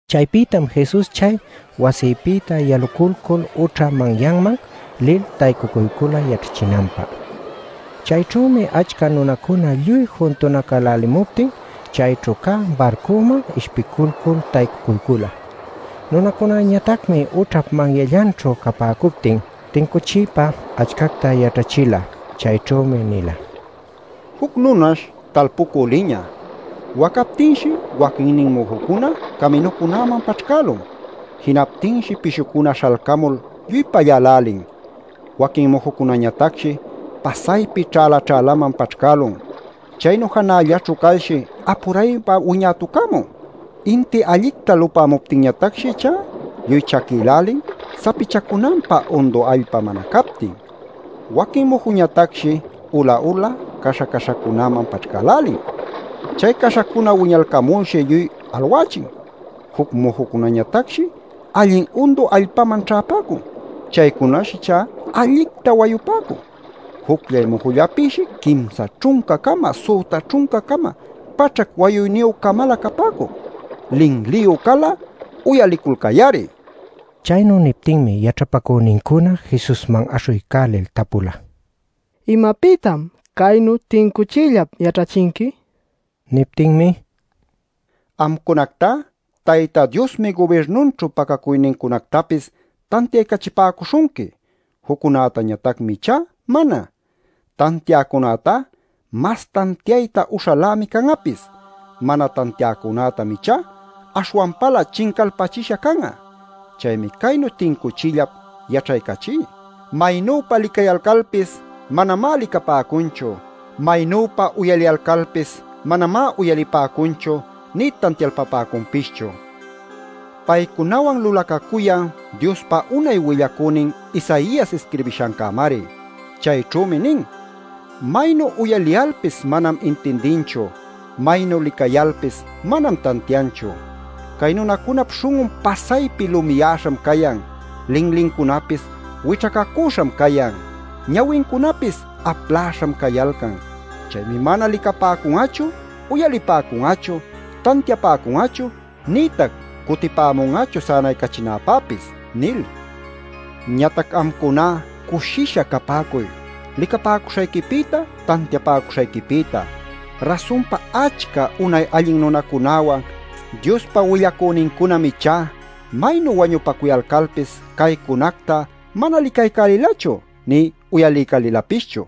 Chaypïtam Jesus chay wasipïta yalulcul ućha manyanman lil taycucuycula yaćhachinanpä. Chayćhümi achca nunacuna lluy juntanacälälimuptin chayćhu cä barcuman ishpilcul taycucuycula. Nunacunañatacmi ućhap manyallanćhu capäcuptin tincuchiypa achcacta yaćhachila. Chayćhümi nila: “Juc nunash talpucü liñä. Wacaptinshi waquinnin mujucuna caminucunäman paćhcälun. Jinaptinshi pishucuna śhalcamul lluy pallälälin. Waquin mujucunañatacshi pasaypi ćhäla-ćhälaman paćhcälun. Chaynu janällaćhu calshi apuraypa wiñätucämun. Inti allicta lupämuptinñatacshi ichá lluy chaquïlälin, sapichacunanpä undu allpa mana captin. Waquin mujucunañatacshi ula-ula, caśha-caśhacunäman paćhcälälin. Chay caśhacuna wiñalcamulshi lluy alwächin. Juc mujucunañatacshi allin undu allpaman ćhäpäcun. Chaycunash ichá allicta wayupäcun. Jucllay mujullapïshi quimsa ćhunca-cama, süta ćhunca-cama, paćhac wayuyniyü-camalä capäcun. ¡Linliyu cal'a, uyaliculcay-ari!” nil. Chaynu niptinmi yaćhapacünincuna Jesusman aśhuycälil tapula: “¿Imapïtam caynu tincuchiyllap yaćhachinqui?” nil. Niptinmi: “Amcunactá Tayta Diosmi gubirnunćhu pacacuynincunactapis tantiaycachipäcuśhunqui. Juccunätañatacmi ichá mana. Tantiäcunätá mas tantiayta uśhalämi can'apis. Mana tantiäcunätam ichá aśhwanpalä chincalpachisha can'a. Chaymi caynu tincuchiyllap yaćhaycachí. Maynüpa licayalcalpis manamá licapäcunchu; maynüpa uyaliyalcalpis manamá uyalipäcunchu nï tantialpapäcunpischu. Paycunawan lulacacuyan Diospa unay willacünin Isaias isquirbishancämari. Chayćhümi nin: ‘Maynu uyaliyalpis manam intindinchu. Maynu licayalpis manam tantianchu. Cay nunacunap śhun'un pasaypi lumiyäśham cayan. Linlincunapis wićhacäcüśham cayan. Ñawincunapis apläśham cayalcan. Chaymi mana licapäcun'achu, uyalipäcun'achu, tantiapäcun'achu, nïtac cutipämun'achu sänaycachinäpäpis’ nil. “Ñatac amcuná cushisha capäcuy, licapäcuśhayquipïta, tantiapäcuśhayquipïta. Rasunpa achca unay allin nunacunäwan, Diospa willacünincunam ichá maynu wañupacuyalcalpis caycunacta mana licaycälilachu nï uyaliycälilapischu.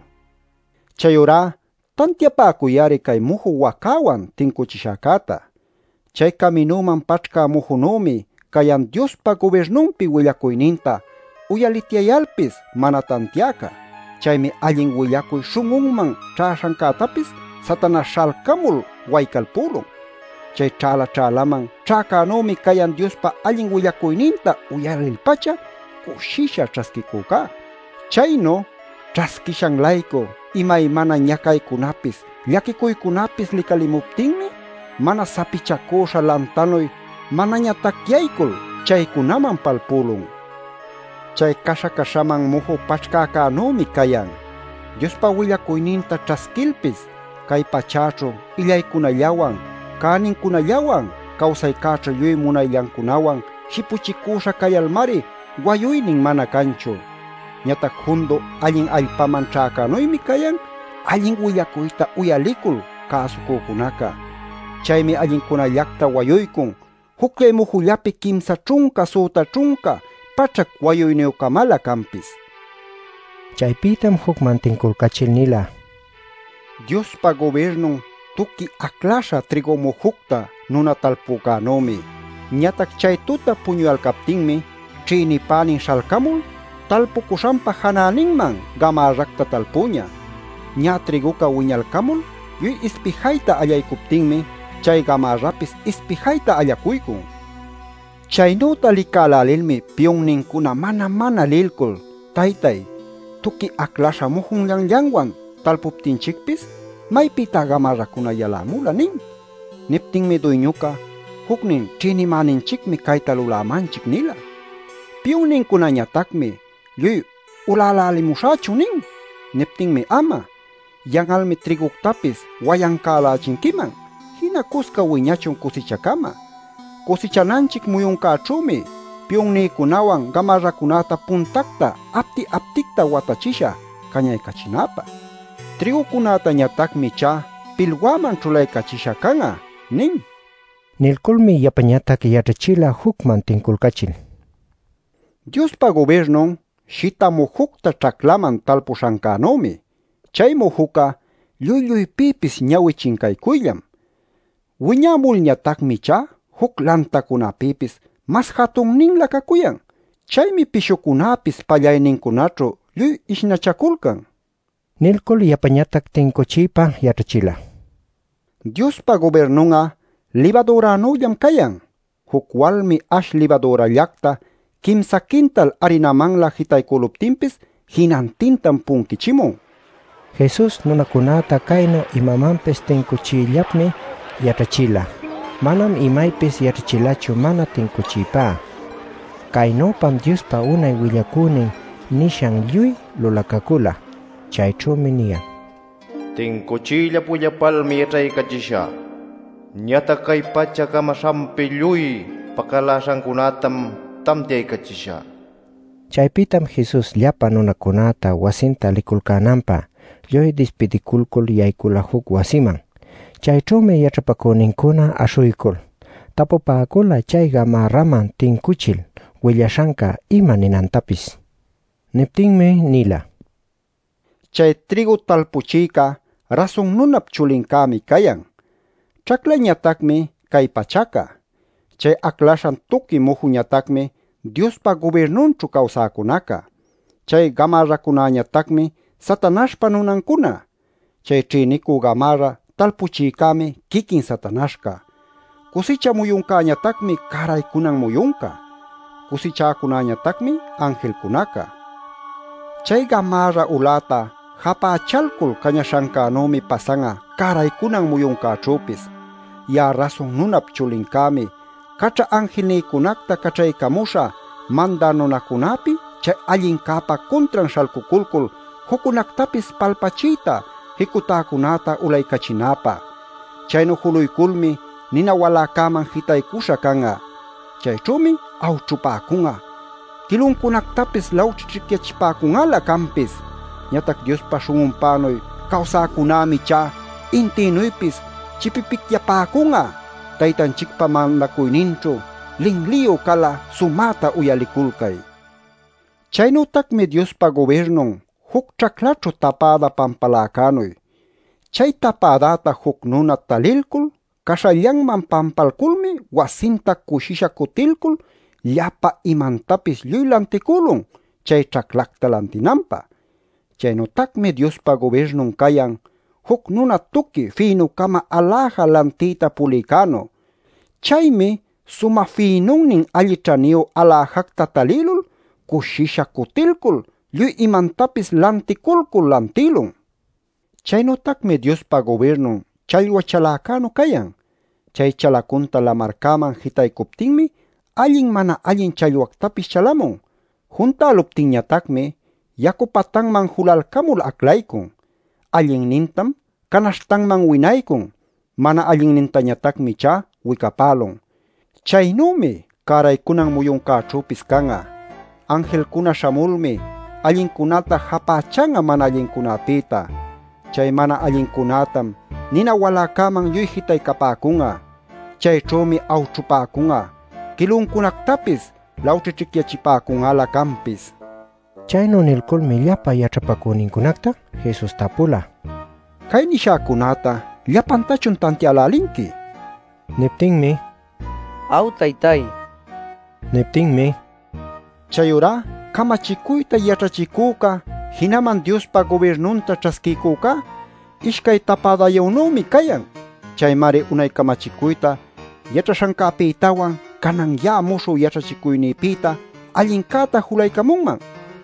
“Chayurá tantiapäcuy-ari cay muju wacäwan tincuchishäcäta. Chay caminüman paćhcä mujunümi cayan Diospa gubirnunpi willacuyninta uyalityayalpis mana tantiäca. Chaymi allin willacuy śhun'unman ćhäśhancätapis Satanaśh śhalcamul waycalpülun. Chay ćhäla-ćhälaman ćhäcänümi cayan Diospa allin willacuyninta uyalil-pacha cushisha ćhasquicüca. Chaynu ćhasquishan-laycu imaymana ñacaycunapis, llaquicuycunapis licalimuptinmi mana sapichacüśha lantanuy manaña tacyaycul chaycunaman palpülun. Chay caśha-caśhaman muju paćhcäcänümi cayan. Diospa willacuyninta ćhasquilpis cay pachäćhu illaycunallawan, cänincunallawan, cawsaycäćhu lluy munayllancunawan shipuchicüśha cayalmari wayuynin mana canchu. Ñatac jundu allin allpaman ćhäcänuymi cayan allin willacuyta uyalicul cäsucüca. Chaymi allincunällacta wayuycun jucllay mujullapi quimsa ćhunca, süta ćhunca, paćhac wayuyniyü-camalä canpis” nin. Chaypïtam jucman tinculcachil nila: “Diospa gubirnun tuqui acläśha trïgu mujucta nuna talpücänümi. Ñatac chay tuta puñuyalcaptinmi, ćhïnipänin śhalcamul talpucuśhanpa janäninman gamärracta talpüña. Ñä trïguca wiñalcamul lluy ispijayta allaycuptinmi, chay gamärrapis ispijayta allacuycun. Chaynüta licälälilmi piyunnincuna mana-mana lilcul: ‘Taytay, tuqui aclaśha mujunllanllanwan talpuchiptinchicpis, ¿maypïtá gamärracuna yalamula?’ nin. “Niptinmi duyñuca: ‘Jucnin ćhïnimäninchicmi cayta lulämanchic’ nila. Piyunnincunañatacmi: ‘¿Lluy ulälälimuśhächun?’ nin. “Niptinmi: ‘Ama. Yan'almi trïguctapis wayancälächinquiman. Jina cusca wiñachun cusichacama. Cusichananchic muyuncäćhümi piyunnïcunäwan gamärracunäta puntacta apti-apticta watachishä cañaycachinäpä. Trïgucunätañatacmi ichá pilwäman ćhulaycachishä can'a’ nin” nila. Nilculmi yapañatac yaćhachila jucman tinculcächil: “Diospa gubirnun shita mujucta ćhaclaman talpuśhancänümi. Chay mujuca lluy lluypïpis ñawi chincaycuyllam. Wiñamulñatacmi ichá juc lantacunapïpis mas jatunninlä cacuyan. Chaymi pishucunäpis pallaynincunaćhu lluy ishnachaculcan” nila. Nilcul yapañatac tincuchiypa yaćhachila: “Diospa gubirnun'a libadüranüllam cayan. Juc walmi ash libadürallacta quimsa quintal arinamanlä jitaycüluptinpis jinantintam punquichimun” nil. Jesus nunacunäta caynu imamanpis tincuchiyllapmi yaćhachila. Manam imaypis yaćhachilachu mana tincuchiypá. Caynüpam Diospa unay willacünin nishanca lluy lulacacüla. Chayćhümi niyan: “Tincuchiyllap willapalmi yaćhaycachishä. Ñatac cay pacha camaśhanpi lluy pacaläśhancunätam tantiaycachishä” nil. Chaypïtam Jesus llapa nunacunäta wasinta liculcänanpä lluy dispidiculcul yaycula juc wasiman. Chayćhümi yaćhapacünincuna aśhuycul tapupäcula chay gamärraman tincuchil willaśhanca ima ninantapis. Niptinmi nila: “Chay trïgu talpuchïcá Rasun Nunap Chulincämi cayan. Ćhaclañatacmi cay pachaca. Chay aclaśhan tuqui mujuñatacmi Diospa gubirnunćhu cawsäcunaca. Chay gamärracunañatacmi Satanaśhpa nunancuna. Chay ćhïnicü gamärra talpuchïcämi quiquin Satanaśhca. Cusicha muyuncäñatacmi cäraycunan muyunca. Cusichäcunanñatacmi anjilcunaca. Chay gamärra uläta japächalcul, cañaśhancänümi pasan'a cäraycunan muyuncäćhüpis. “Ya'a Rasun Nunap Chulincämi caćha anjilnïcunacta caćhaycamuśhä mandä nunäcunapi chay allincäpa cuntran śhalcuculcul juccunactapis palpachiyta jicutäcunäta ulaycachinäpä. Chaynu juluyculmi nina waläcäman jitaycuśha can'a. Chayćhümi awćhupäcun'a; quiluncunactapis lawćhićhicyachipäcun'alä canpis. Ñatac Diospa śhun'unpänuy cawsacunämi ichá intïnuypis chipipicyapäcun'a Taytanchicpa mandacuyninćhu. Linliyu cal'a sumäta uyaliculcay. “Chaynütacmi Diospa gubirnun juc ćhaclaćhu tapäda pampaläcänuy. Chay tapädäta juc nuna talilcul caśhallanman pampalculmi wasinta cushisha cutilcul, llapa imantapis lluy lanticülun chay ćhaclacta lantinanpä. “Chaynütacmi Diospa gubirnun cayan, juc nuna tuqui fïnucama aläja lantiyta pulïcänu. Chaymi sumä fïnunnin alli ćhaniyu aläjacta talïlul, cushisha cutilcul lluy imantapis lanticulcul lantïlun. “Chaynütacmi Diospa gubirnun challwa chaläcänu cayan. Chay chalacunta lamarcäman jitaycuptinmi allin, mana allin challwactapis chalamun. Juntäluptinñatacmi yacu patanman julalcamul aclaycun. Allinnintam canaśhtanman winaycun, mana allinnintañatacmi ichá wicapälun. Chaynümi cäraycunan muyuncäćhüpis can'a. Anjilcuna śhamulmi allincunäta, japächan'a mana allincunapïta. Chay mana allincunätam nina waläcäman lluy jitaycapäcun'a. Chayćhümi awćhupäcun'a, quiluncunactapis lawćhićhicyachipäcun'alä canpis” nin. Chaynu nilculmi llapa yaćhapacünincunacta Jesus tapula: “Cay nishäcunäta ¿llapantachun tantiälälinqui?” nil. Niptinmi: “Aw, taytay” nipäcula. Niptinmi: “Chayurá camachicuyta yaćhachicüca jinaman Diospa gubirnunta ćhasquiycücá ishcay tapädayünümi cayan. Chaymari unay camachicuyta yaćhaśhancäpïtawan, canan ya'a muśhü yaćhachicuynïpïta allincäta julaycamunman” nin.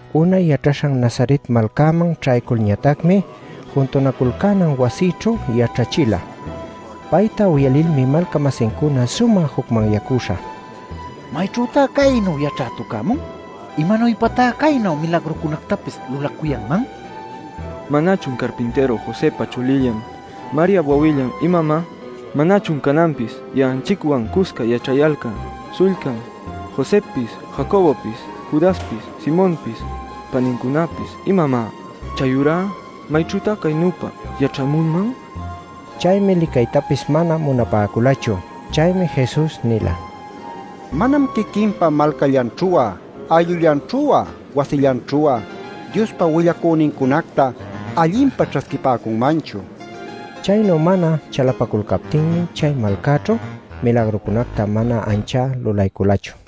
Unay yaćhaśhan Nazaret malcanman ćhayculñatacmi juntunaculcänan wasićhu yaćhachila. Payta uyalilmi malca-masincuna sumä jucmanyacüśha: “¿Mayćhütá caynu yaćhätucämun? ¿Imanuypatá caynu milagrucunactapis lulacuyanman? ¿Manachun carpintïru Josëpa chulillan Mariap wawillan imamá? ¿Manachun cananpis ya'anchicwan cusca yaćhayalcan śhullcan Josëpis, Jacobopis, Judaspis, Simonpis panincunapis, imamá? Chayurá ¿mayćhütá caynüpa yaćhämunman?” nipäcula. Chaymi licaytapis mana munapäculachu. Chaymi Jesus nila: “Manam quiquinpa malcallanćhu'a ayllullanćhu'a wasillanćhu'a Diospa willacünincunacta allinpa ćhasquipäcunmanchu” nil. Chaynu mana chalapaculcaptinmi chay malcaćhu milagrucunacta mana anchá lulayculachu.